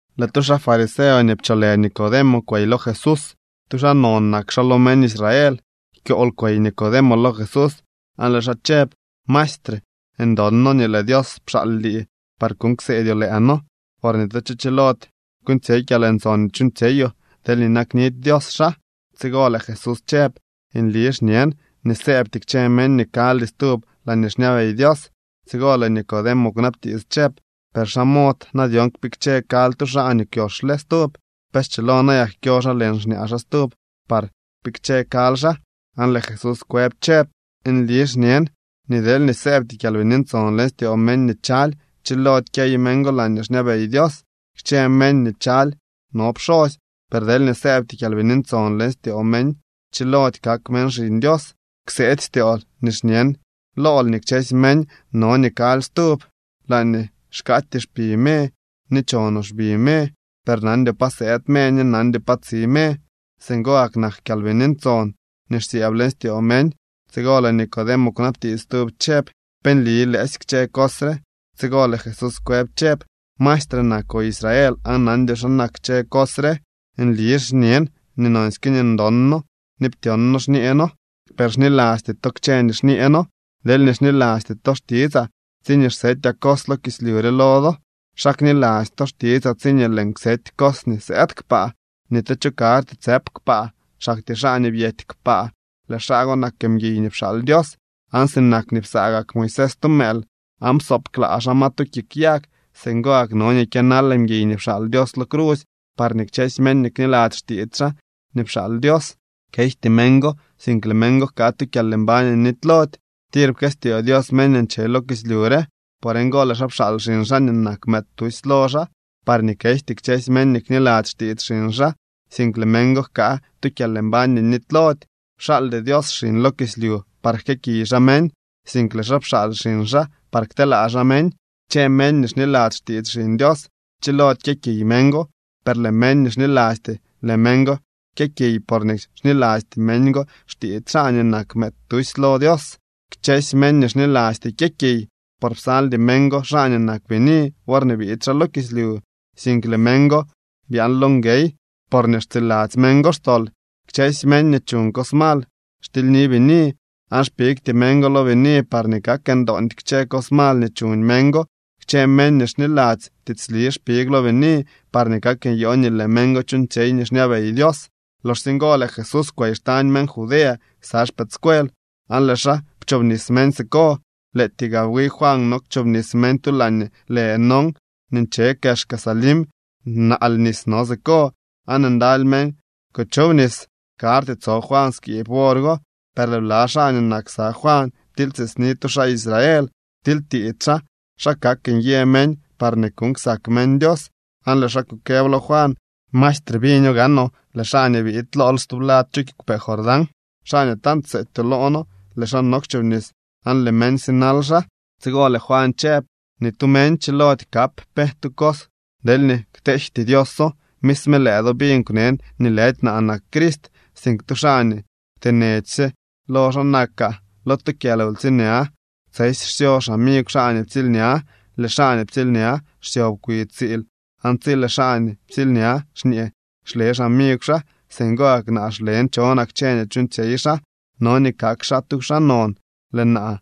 Lëë tu xaa fariseo nii pcholë Nicodemo kwey lo Jesús. Tu xaa non nak xaa lo meñ Israel. Kyool kwey Nicodemo lo Jesús aan lëë xaa chëb: —Maestre, ndon noo nii lëë Dios pxaal lii par kuuñ kseedyoo lëë noo, por ni tu cho chilody kuuñtsyey kyalntson nii chuuñtsyeyoo deelñee naknidy Dios xaa. Tsigo lëë Jesús chëb: —Nli xñen nii sëëbty kchë meñ nii kaldy stub laañee xñabey Dios. Tsigo lëë Nicodemo kwnabtiits chëb: —¿Per xa mod na dyon kpikche kaly tu xaa nii kwyoxle stub? ¿Pe schilo nayak kyo xaa leñ xñaa xaa stub par kpikche kaly xaa? Aan lëë Jesús kwëb chëb: —Nli xñen nii deelñee sëëbty Kyalbini Ntson leñ styoo meñ nii chaly, chilody kyey meñ go laañee xñabey Dios. Kchë meñ nii chaly no pxosy, per deelñee sëëbty Kyalbini Ntson leñ styoo meñ, chilody kak meñ xiñ Dios. Kseety styool nii xñen lool nii kchësy meñ no nii kaly stub. Laañee xkaatyee xpi me ni chonoo xbi me, per nandyoo pa sëëd me ni nandyoo pa tsi me. Singo gak nak Kyalbini Ntson nii xsyëëb leñ styoo meñ. Tsigo lëë Nicodemo kwnabtiits stub chëb: —¿Pe nli lëësy kchë cos re? Tsigo lëë Jesús kwëb chëb: —¿Maestre nakoo Israel aan nandyoo xa nak kchë cos re? Nli xñen nii nonsyke nii ndon noo ni ptyon noo xñee noo. Per xnilasty to kchë nii xñee noo. Deelñee xnilasty to xtitsaa tsiñee xsetyaa cos lo kislyu re lo do, ¿xa kniladzy to xtitsaa tsiñee lëën kseety cos nii sëëd kpaa? ’Ni tu cho karty tsëp kpaa, xaktyee xaa nii byety kpaa. Lëë xaa go nak mguiy nii pxaal Dios. Aan sinak nii psaa gak Moisés tu mëël aan psoob klaa xaa ma tu kik yag, singo gak no nii kyënal mguiy nii pxaal Dios lo crusy, parñee kchësy meñ nii kniladzy xtiits xaa nii pxaal Dios, kejty meñ go, sink lëë meñ go jkaa tu kyalmbañ nii nitylody. ’Tir pkëstyoo Dios meñ nii nche lo kislyu re. Por ngo lëë xaa pxaal xiñ xaa nii nak mëëd tusy lo xaa, parñee kejty kchësy meñ nii kniladzy xtiits xiñ xaa, sink lëë meñ go jkaa tu kyalmbañ nii nitylody. Pxaaldy Dios xiñ lo kislyu par jkëëkiy xaa meñ, sink lëë xaa pxaal xiñ xaa par kteelaa xaa meñ. ’Kchë meñ nii xniladzy xtiits Xiñ Dios chilody kyëkiy meñ go, per lëë meñ nii xnilasty, lëë meñ go kyëkiy porñee xnilasty meñ go xtiits xaa nii nak mëëd tusy lo Dios. Kchësy meñ nii xnilasty kyëkiy, por psaldy meñ go xaa nii nak bini worñee biid xaa lo kislyu, sink lëë meñ go byaan lo nguey porñee xtsiladzy meñ go xtol. Kchësy meñ nii chuñ cos mal xtilyni bini, aan xpigty meñ go lo bini parñee kak ndoondy kchë cos mal nii chuñ meñ go. Kchë meñ nii xniladzy tiitsli xpig lo bini parñee kak nyoo nii lëë meñ go chuuñtsyey nii xñabey Dios. Loxsye ngo lëë Jesús kwey xtañ meñ Judea ksa xpëëdscuel, aan lëë xaa pchoobnis meñ siko. Lëëtyee gaa wi Juan no kchoobnis meñ tu laañee lë Enón nii nche kexka Salim. Naal nis no siko, aan ndaly meñ kuchobnis. Karty tso Juan skiib wor go. Per lëë bla xaa nii nak ksa Juan ptilytiitsni tu xaa Israel. Ptilytiits xaa xa kak nyë meñ parñee kuuñ ksak meñ Dios. Aan lëë xaa kukëb lo Juan: —Maestre, biño gaanoo, lëë xaa nii biid lool stublad chu kiigwpee Jordán, xaa nii tant pseetyoo loo noo, lëë xaa no kchoobnis aan lëë meñ sinal xaa. Tsigo lëë Juan chëb: —Ni tu meñ chilody kap pe tu cos deelñee kteejty Dioso. Misme lëë do biñ kwnen nii lëdy naa nak Crist, sink tu xaa nii kwtenechsye lo xaa nakaa. Lo tu kyalwtsiilña tsesy xsyo xamigw xaa nii ptsiilña. Lëë xaa nii ptsiilña xsyob kwi tsiil, aan tsi lëë xaa nii ptsiilña xñee, xle xamigw xaa. Singo gak naa xlen chonaa kchë nii chuuñtsyey xaa. No nii kak xaa tu xaa non, lëë naa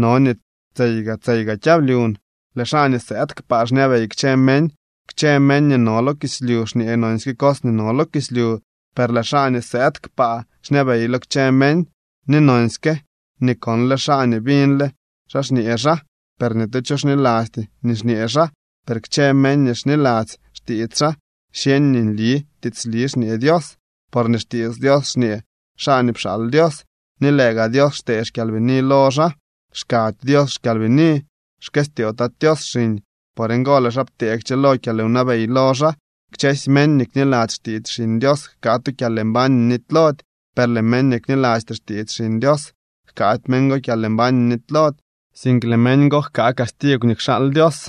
no nii tseyga tseyga kyablyun. ’Lëë xaa nii sëëd kpaa xñabey kchë meñ. Kchë meñ nii no lo kislyu xñee nonsyke cos nii no lo kislyu. Per lëë xaa nii sëëd kpaa xñabey lo kchë meñ, ni nonsyke nii konle xaa ni biñle xaa xñee xaa. Per ni tu cho xnilasty nii xñee xaa. Per kchë meñ nii xniladzy xtiits xaa xyeñ nii nli tiitsli xñee Dios. Porque xtiits Dios xñee xaa nii pxaal Dios, ni lëë gaa Dios xtee xKyalbini lo xaa, xkady Dios xKyalbini. Xkëstyoo Tat Tios xiñ, por ngo lëë xaa ptee kchëlo kyalwnabey lo xaa. Kchësy meñ nii kniladzy xtiits Xiñ Dios jkaa tu kyalmbañ nii nitylody. Per lëë meñ nii knilasty xtiits Xiñ Dios, jkaady meñ go kyalmbañ nii nitylody, sink lëë meñ go jkaa castigw nii kxaal Dios.